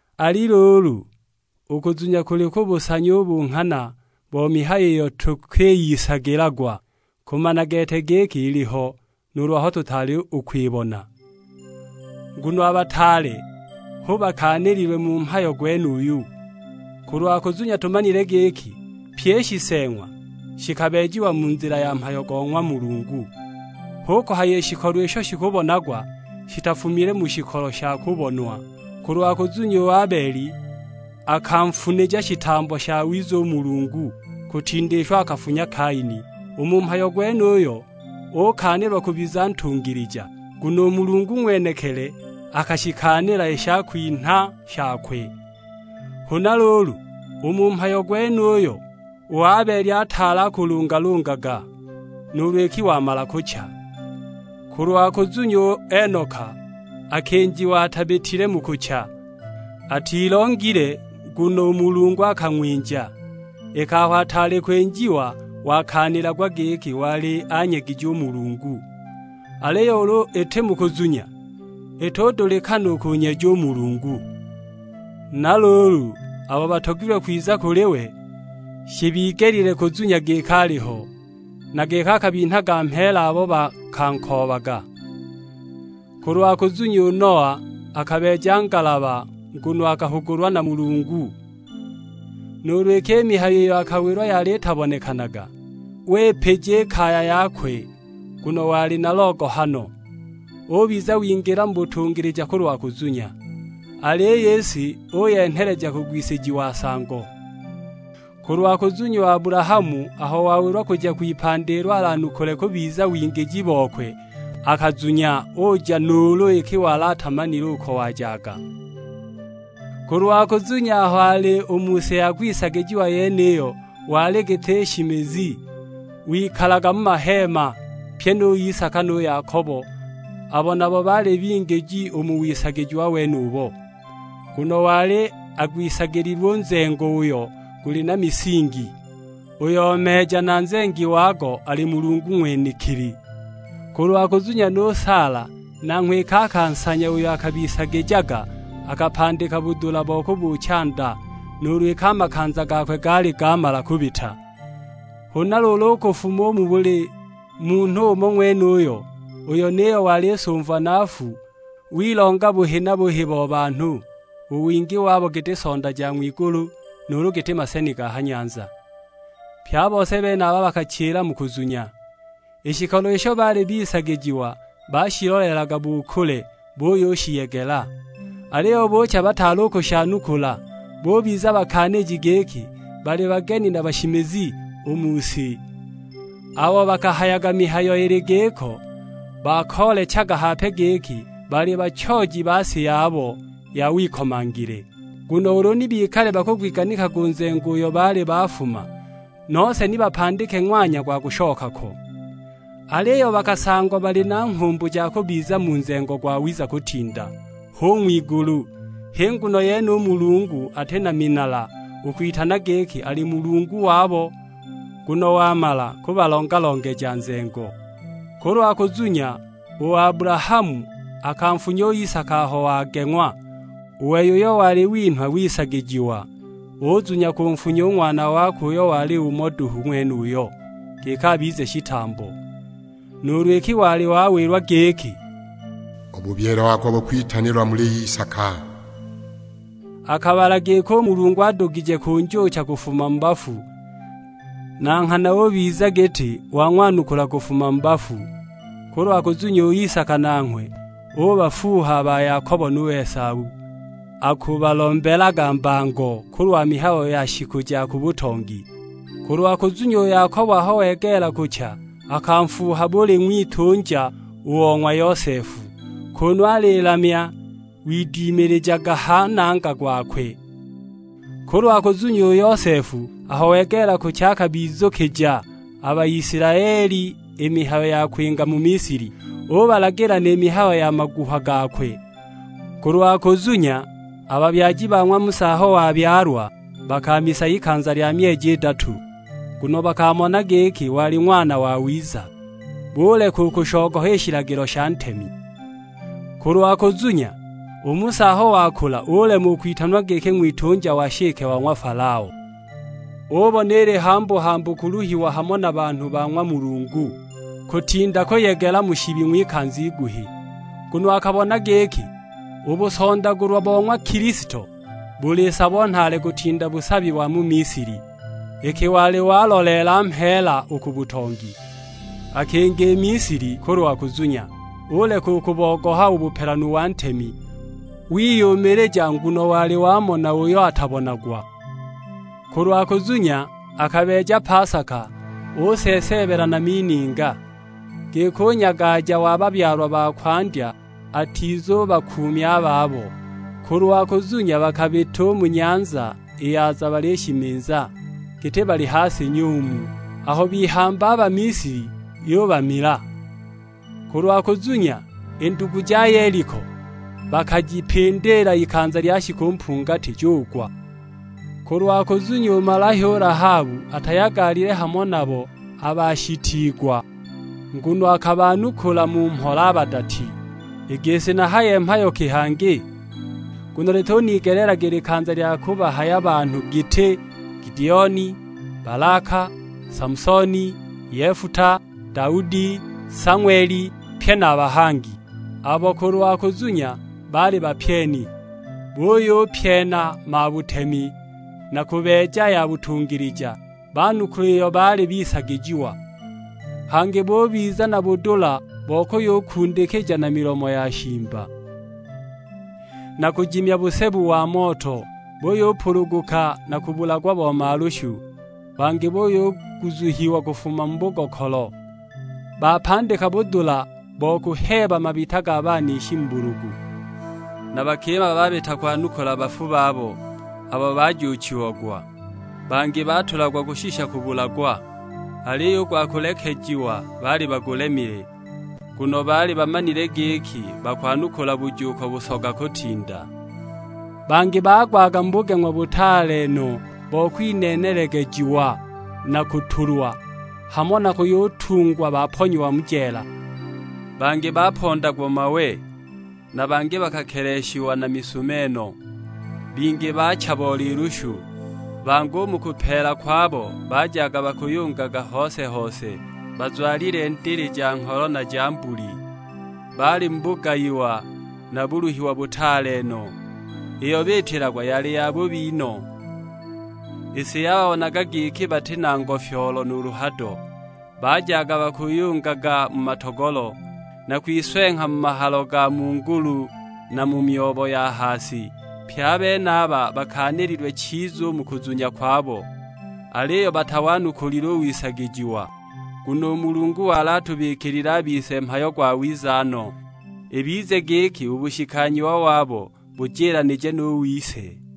Ali luulu, u kuzunya kuli kubusanya u bunghana bo mihayo iyo tukwiyisagilagwa, kumana gete giki iliho, nuulu aho tutaali u kwibona. Nguno a bataale hu bakaanililwe mu mhayo gwenuyo. Kulwa kuzunya tumanile giki pyi i shiseeng'wa shikabeejiwa mu nzila ya mhayo go ng'wa Mulungu, hu kuhaya i shikolo isho shikubonagwa shitafumile mu shikolo sha kubonwa. Kulwa kuzunya u Abeli akanfunija shitambo shawiza u Mulungu, kutinda isho akafunya Kaini, u mu mhayo gwenuyo ukaanilwa kubiza ntungilija, nguno u Mulungu ng'wenekili akashikaanila i shakwinha shakwe. Huna luulu, u mu mhayo gwenuyo u Abeli ataali akulungalungaga, nuulu iki wamala kucha. Kulwa kuzunya u Enoka akinjiwa atabitile mu kucha. Atilongile nguno u Mulungu akang'winja, iki aho ataali kwinjiwa wakaanilagwa giki wali anyegije u Mulungu. Aliyo ulu iti mu kuzunya, itudulikana u kunyeja u Mulungu. Na luulu abo batogilwe kwiza kuli we, shibigelile kuzunya giki aliho, na giki akabinhaga mheela abo bakankoobaga. Kulwa kuzunya u Noa akabeeja ngalaba nguno akahugulwa na Mulungu, nuulu iki i mihayo iyo akawilwa yali itabonekanaga; wipija i kaya yakwe nguno wali na logohano. Ubiza wingila mu butungilija kulwa kuzunya, aliyo i si uyenheleja kugwisijiwa nsango. Kulwa kuzunya u Abulahamu aho wawilwa kuja kwipandi ilo alanukule kubiza wingiji bokwe, akazunya uja nuulu iki wali atamanile uko wajaga. Kulwa kuzunya aho ali u mu si ya kwisagijiwa yeniyo wali giti nshimizi; wikalaga mu maheema, pye nu Isaka nu Yakobo, abo nabo baali bingiji u mu wisagijiwa wenubo. Nguno wali agwisagililwe u nzengo uyo guli na misingi; uyo meeja na nzengi wago ali Mulungu ng'wenekili. Kulwa kuzunya nu Saala nanghwe iki akansanya uyo akabisagijaga, akapandika budula bo kubuucha nda, nuulu iki a makanza gakwe gaali gamala kubita. Huna luulu u kufuma u muli munhu umo ng'wenuyo, uyo niyo wali sumva na nfu, wilonga buhi na buhi bo banhu, u wingi wabo giti sonda ja ng'wigulu, nuulu giti maseni ga ha nyanza. Pye a bose benaba bakachila mu kuzunya, i shikolo isho baali bisagijiwa bashiloleelaga bu kule buyushiyegela. Aliyo buucha bataali u kushanukula, bubiza bakaaniji giki baali bageni na bashimizi u mu si. Abo bakahayaga mihayo ili giko, bakoolechaga hape giki bali bachooji ba si yabo ya wikomangile. Nguno ulu ni bikale bakugwiganikaga u nzengo uyo baali bafuma, nose ni bapandike ng'wanya gwa kushoka ko. Aliyo bakasangwa bali na nghumbu ja kubiza mu nzengo gwawiza kutinda, h'u ng'wigulu; h'i nguno yene u Mulungu ati na minala u kwitanwa giki ali Mulungu wabo, nguno wamala kubalonja-longeja nzengo. Kulwa kuzunya, u Abulahamu akanfunya u Isaka aho wageng'wa; u wei uyo wali winhwa wisagijiwa, uzunya kunfunya u ng'wana wakwe uyo wali umo duhu ng'wenuyo, giki abize shitambo; nuulu iki wali wawilwa giki, "U bubyile wako bukwitanilwa muli Isaka." Akabala giki u Mulungu adugije kunjuucha kufuma mu bafu; na nghana ubiza giti wang'wanukula kufuma mu bafu. Kulwa kuzunya, u Isaka nanghwe ubafuuha a ba Yakobo nu Esau, akubalombelaga mbango kulwa mihayo ya shiku ja ku butongi. Kulwa kuzunya, u Yakobo aho wegeela kucha akanfuuha buli ng'witunja o ng'wa Yosefu, kunu alilamya widimilijaga ha nangha gwakwe. Kulwa kuzunya, u Yosefu aho wegeela kucha akabizukija a Baisilaeli i mihayo ya kwinga mu Misili, ubalagila ni mihayo ya maguha gakwe. Kulwa kuzunya, a babyaji ba ng'wa Musa aho wabyalwa, bakamisa ikanza lya myeji idatu, nguno bakamona giki wali ng'wana wawiza; buleka u kushogoha i shilagilo sha ntemi. Kulwa kuzunya, u Musa aho wakula ulema u kwitanwa giki ng'witunja wa nshike wa ng'wa Falao. Ubona ili hambu-hambu kuluhiwa hamo na banhu ba ng'wa Mulungu, kutinda kuyegela mu shibi ng'wikanza iguhi. Nguno akabona giki, u busondagulwa bo ng'wa Kilisto buli sabo nhaale kutinda busabi wa mu Misili, iki wali waloleela mheela u ku butongi. Akinga i Misili kulwa kuzunya, uleka u kubogoha u bupelanu wa ntemi; wiyumilija nguno wali wamona uyo atabonagwa. Kulwa kuzunya, akabeeja pasaka useeseebela na mininga, giki u nyagaja wa babyalwa ba kwandya atizubakuumya a babo. Kulwa kuzunya bakabita u mu Nyanza i Yaza balishimiza, giti bali ha si nyumu; aho bihamba a Bamisili yubamila. Kulwa kuzunya, i ndugu ja Yeliko bakajipindiila ikanza lya shiku mpungati, jugwa. Kulwa kuzunya, u malahya u Lahabu atayagalile hamo nabo a bashitiigwa, nguno akabanukula mu mhola a badati. I gisi nahaye mhayo ki hangi? Nguno lituniigelaga i likanza lya kubahaya banhu giti: Gidioni, Balaka, Samusoni, Yefuta, Daudi, Sang'weli; pye na a bahangi, abo kulwa kuzunya baali bapyeni, buyupyena mabutemi na kubeeja ya butungilija, banukula iyo baali bisagijiwa. Hangi bubiza na budula bo kuyukundikija na milomo ya shimba, na kujimya busebu wa moto; buyupuluguka na kubulagwa bo malushu. Bangi buyuguzuhiwa kufuma mu bugokolo, bapandika budula bo kuheeba mabita ga banishi mu bulugu. Na bakima babita kwanukula bafu babo, abo bakayujuuchiwa. Bangi batulagwa kushisha kubulagwa, aliyo u gwa kulekejiwa baali bagulemile, nguno baali bamanile giki bakwanukula bujuuko busoga kutinda. Bangi bagwaga mu bugeng'wa butaale no bo kwineenelegejiwa na kutulwa, hamo na kuyutungwa baponyiwa mu jeela. Bangi bapondagwa mawe, na bangi bakeleshiagwa na misumeno; bingi baacha bo lilushu. Bangi u mu kupeela kwabo bajaga bakuyungaga hose-hose, bazwalile ndili ja ngholo na ja mbuli. Baali mu bugayiwa na buluhiwa butaale no; iyo biitilagwa yali yabubi no! I si yababonaga giki bati na ngofyoolo nuulu hado; bajaga bakuyungaga mu matogolo, na kwiswengha mu mahalo ga mu ngulu na mu myobo ya ha si! Pye a benaba bakaanililwe chiza u mu kuzunya kwabo, aliyo batawanukulile u wisagijiwa. Nguno u Mulungu wali atubikilile a bise mhayo gwawiza no; ibize giki u bushikanyiwa wabo bujilanije nu wise.